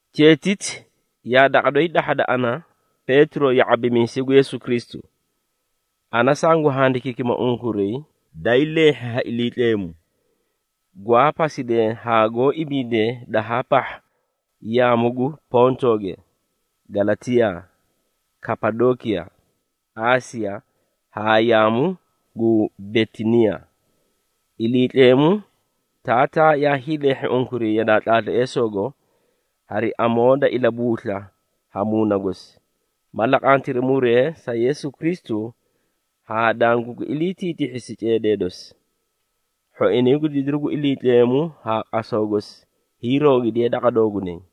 Cheetiti yaa daqa doyi dahhada ana, Peetiro, ya⁄abimiisay gu Yeesu Kristu. Ana sangu handikiikima unkuray daay leehhi ha Iliitleemu, gwaa pasidee haa goó ibiidee dahaa pahha yaamu gu Pontooge, Galatiyaa, Kapadookiya, Aasiya haa yaamu gu Bitiniiya. Iliitleemu Taataa yaa hiileehhi unkuray yadaa tlaatleesoogo, hari amoo da ilabuusla ha Muuna gosi, ma laqantiri muree sa Yeesu Kristu haa dangugi iliitiitihhisi ceedee dosi. Hhoinay gu didiru gu Iliitleemu haa qasaw gosi hiiroogidiye daqa doogunay.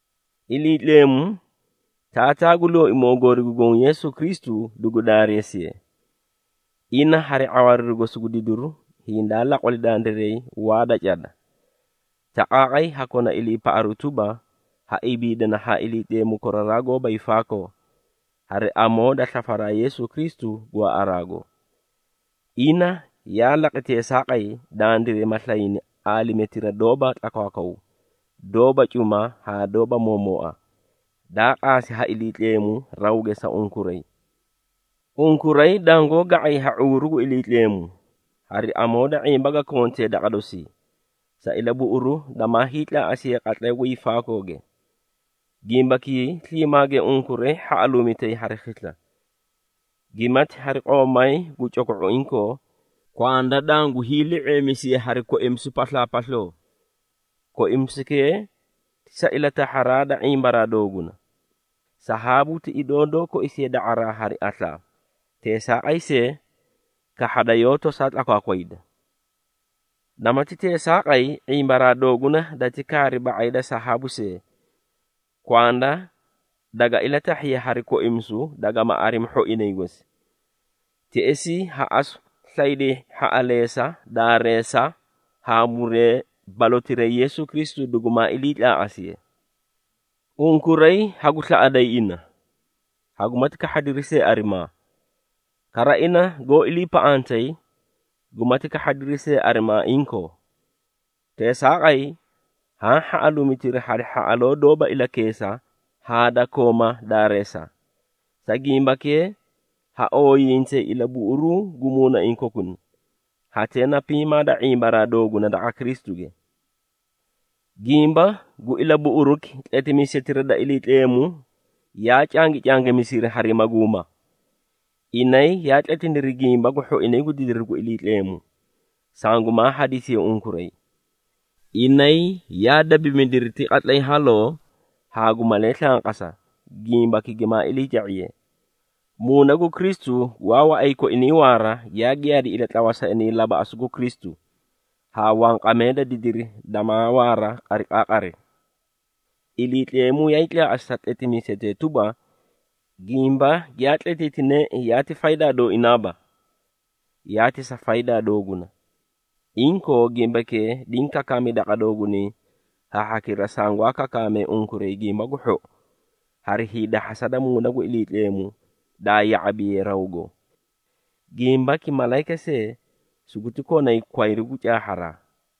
Iliitleemu, Taataa gu Looimoo goori gu Goõ Yeesu Kristu dugu daareesiye! Ina hari ⁄awaariru gosi gu didiru, hindaa laqwali dandiray waa da cada, taqaaqay ha kona iliipaꞌaru tuba, ha ibiidana haa Iliitleemu koraraa gooba hiifaakoo, hari amoo da slafisaraa Yeesu Kristu gwaaꞌaraago. Ina yaa laqi teesaaqay, dandiray ma slayni aalimetira doóba tlakwaakwaw, doóba cuma haa doóba moomooa, daa qaasi ha Iliitleemu rawge sa unkuray. Unkuray dangoó ga⁄ay ha ⁄uuru gu Iliitleemu, hari amoo da ⁄imba ga kontee daqa dosii, sa ilabuꞌuru damaay tlaaꞌasiye qatlay gu hiifaakooge. Gimbakii sliimaage unkuray hhaꞌaluumitay hari khisla, gimati hari qoomay gu coko⁄o inkoo, kwanda dangu hiili⁄eemisiye hari koimisu paslaapasloo. Koimisukee ti sa ilatahharaa da ⁄imbaraa dooguna. Sahaabu ti idoo doó koisiye da⁄araa hari aslaa, teesaaqay see, kahhada yoó tosaa tlakwakwayda. Namati teesaaqay, ⁄imbaraa dooguna dati kaari ba⁄ay da sahaabu see, kwanda daga ilatahhiye hari koimisu, dagama arimi hhoinay gosi. Teꞌesii ha asu slayday hhaꞌaleesa, daareesa haa muree balotirayi Yeesu Kristu dugumaa iliitlaaꞌasiye. Unkuray hagu slaꞌaday ina, hagumati kahhadiri see arimaa. Kara ina goó iliipaꞌantay, gumati kahhadiri see arimaa inkoo. Teesaaqay, haã hhaꞌaluumitiri hari hhaꞌaloo doóba ilakeesa haa da kooma daareesa, sa gimbakee, ha ooyiiyintayi ilabuꞌuruu gu muunaiĩ kokuna, hatee na piimaa da ⁄imbaraa dooguna daqa Kristuge. Gimba gu ilabuꞌuruki, tletimiisetira da Iliitleemu yaa cangicangimisiri hari maguuma. Inay yaa tletiniri gimba gu hhoinay gu didiru gu Iliitleemu, sangumaa hadisiye unkuray. Inay yaa dabimidiri ti qatlay haloo haa gu malee slanqasa, gimbaki gimaa iliica⁄iye. Muuna gu Kristu gwaa waꞌay koinay waara, yaa giyaadi ilatlawa sa inay labaꞌasu gu Kristu, haa gu wanqamee da didiri damaa waara qariqaaqari. Iliitleemu yaay tlaaꞌasi sa tletimiisetee tuba, gimba giyaa tletiitineei yaati faydaa dooinaaba, yaati sa faydaa dooguna. Inkoo, gimbakee diĩ kakaami daqa doogunay ha hhakira sangwaa kakaamee unkuray Gimba gu Hhou, hari hiidahhasa da Muuna gu Iliitleemu daa ya⁄abiye rawgo. Gimbaki malayika see, suguti konay kwayru gu caahharaa.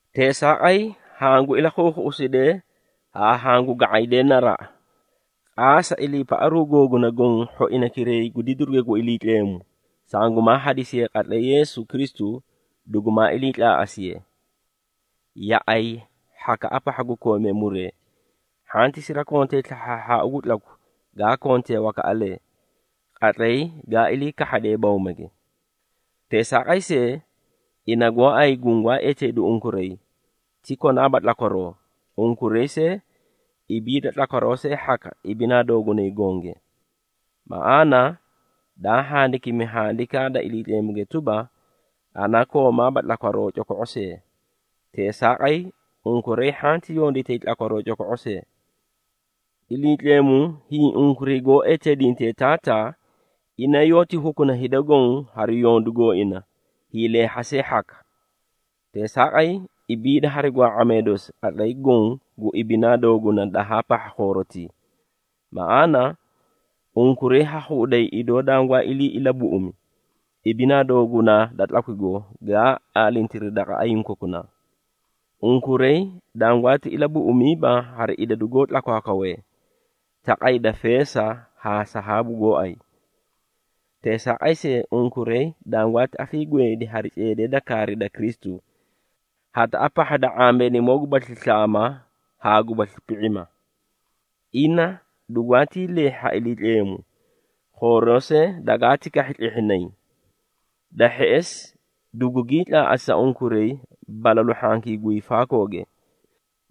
Teesaaqay, hangu ilakhuukhuꞌusidee haa hangu ga⁄aydee naraꞌa. Qaasa iliipaꞌaru googuna goõ hhoinaykiray gu didiruge gu Iliitleemu, sangumaa hadisiye qatlay Yeesu Kristu dugumaa iliitlaaꞌasiye. Yaꞌay hhakaꞌa pahha gu koomee muree, hhanti sirakontay slahhaahhaau gu tlaku gaa kontee wakaꞌalee, qatlay gaa ilii kahhadee bawmage. Teesaaqay see, ina gooay gungwaa eteedu unkuray, ti konaaba tlakwaroo, unkuray see, ibiida tlakwaroo see hhaka, ibinaa doogunay gonge. Maꞌaana, daa handakimi Handikaa da Iliitleemuge tuba, “Ana koomaaba tlakwaroo coko⁄o see, teesaaqay, unkuray hhanti yonditay tlakwaroo coko⁄o see.” Iliitleemu, hiĩ unkuray goó eteedintee Taataa, ina yoóti hukuna hida goõ hari yondu gooina hiileehha see hhaka. Teesaaqay, ibiida hari gwaa⁄amee dosi, qatlay goõ gu ibinaa dooguna dahaa pahha khoorotii. Maꞌaana, unkuray ha khuꞌuday idoo dangwaa ilii ilabuꞌumi, ibinaa doogunaa da tlakwigo, gaa aalintiri daqa ayiĩ kokunaa. Unkuray dangwaati ilabuꞌumiiba hari idadu goó tlakwaakwawee, taqay da feesa haa sahaabu gooay. Teesaaqay see, unkuray dangwaati afiigweedi hari ceedee da kaari da Kristu, hataꞌa pahha da ⁄ambeenimoo gubasli slaama haa gubasli pi⁄ima. Ina dugwaatii leehhi ha Iliitleemu, khooroo see dagaati kahhi tlehhinay. Da hheꞌesi, dugugii tlaaꞌasi sa unkuray balalu hhankii gu hiifaakooge.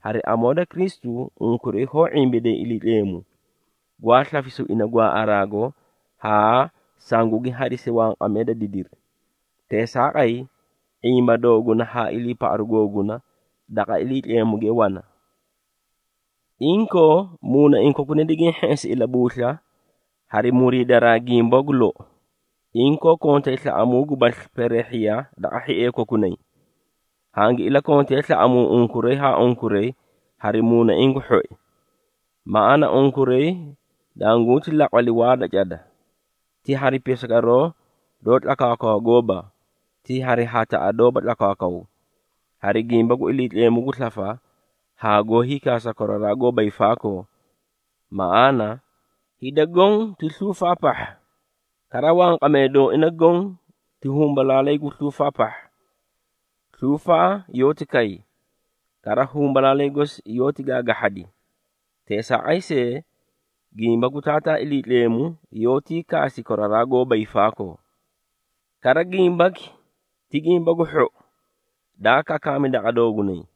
Hari amoo da Kristu, unkuray hoó ⁄imbiday Iliitleemu, gwaa slafisu ina gwaaꞌaraago haa sugugi hadisi wanqamee da didiri. Teesaaqay, ⁄imba dooguna haa iliipaꞌaru googuna, daqa Iliitleemuge wana. Inkoo, muunaiĩ kokuna digiĩ hheꞌesi ilabuusla, hari muriidaraa gimba gu lou, inkoo kontay slaꞌamuu gubasli peereehhiya daqa hhiee kokunay. Hangi ilakontee slaꞌamuu unkuray haa unkuray hari muunaiĩ gu hhoi. Maꞌaana, unkuray dangunti laqwali waa da cada, ti hari pisagoroo doó tlakwaakwawa gooba, ti hari hataꞌa doóba tlakwaakwaw, hari gimba gu Iliitleemu gu slafa haa goó hiikaasa koraraa goóba hiifaakoo. Maꞌaana, “Hida goõ ti sluufaa pahha, kara, wanqamee dooina goõ, ti humbalaalay gu sluufaa pahha. Sluufaa yoóti kay, kara, humbalaalay gosi yoóti gaagahhadi, teesaaqay see, gimba gu Taataa Iliitleemu, yoótii kaasi koraraa goóba hiifaakoo.” Kara gimbaki ti Gimba gu Hhou, daa kakaami daqa doogunay.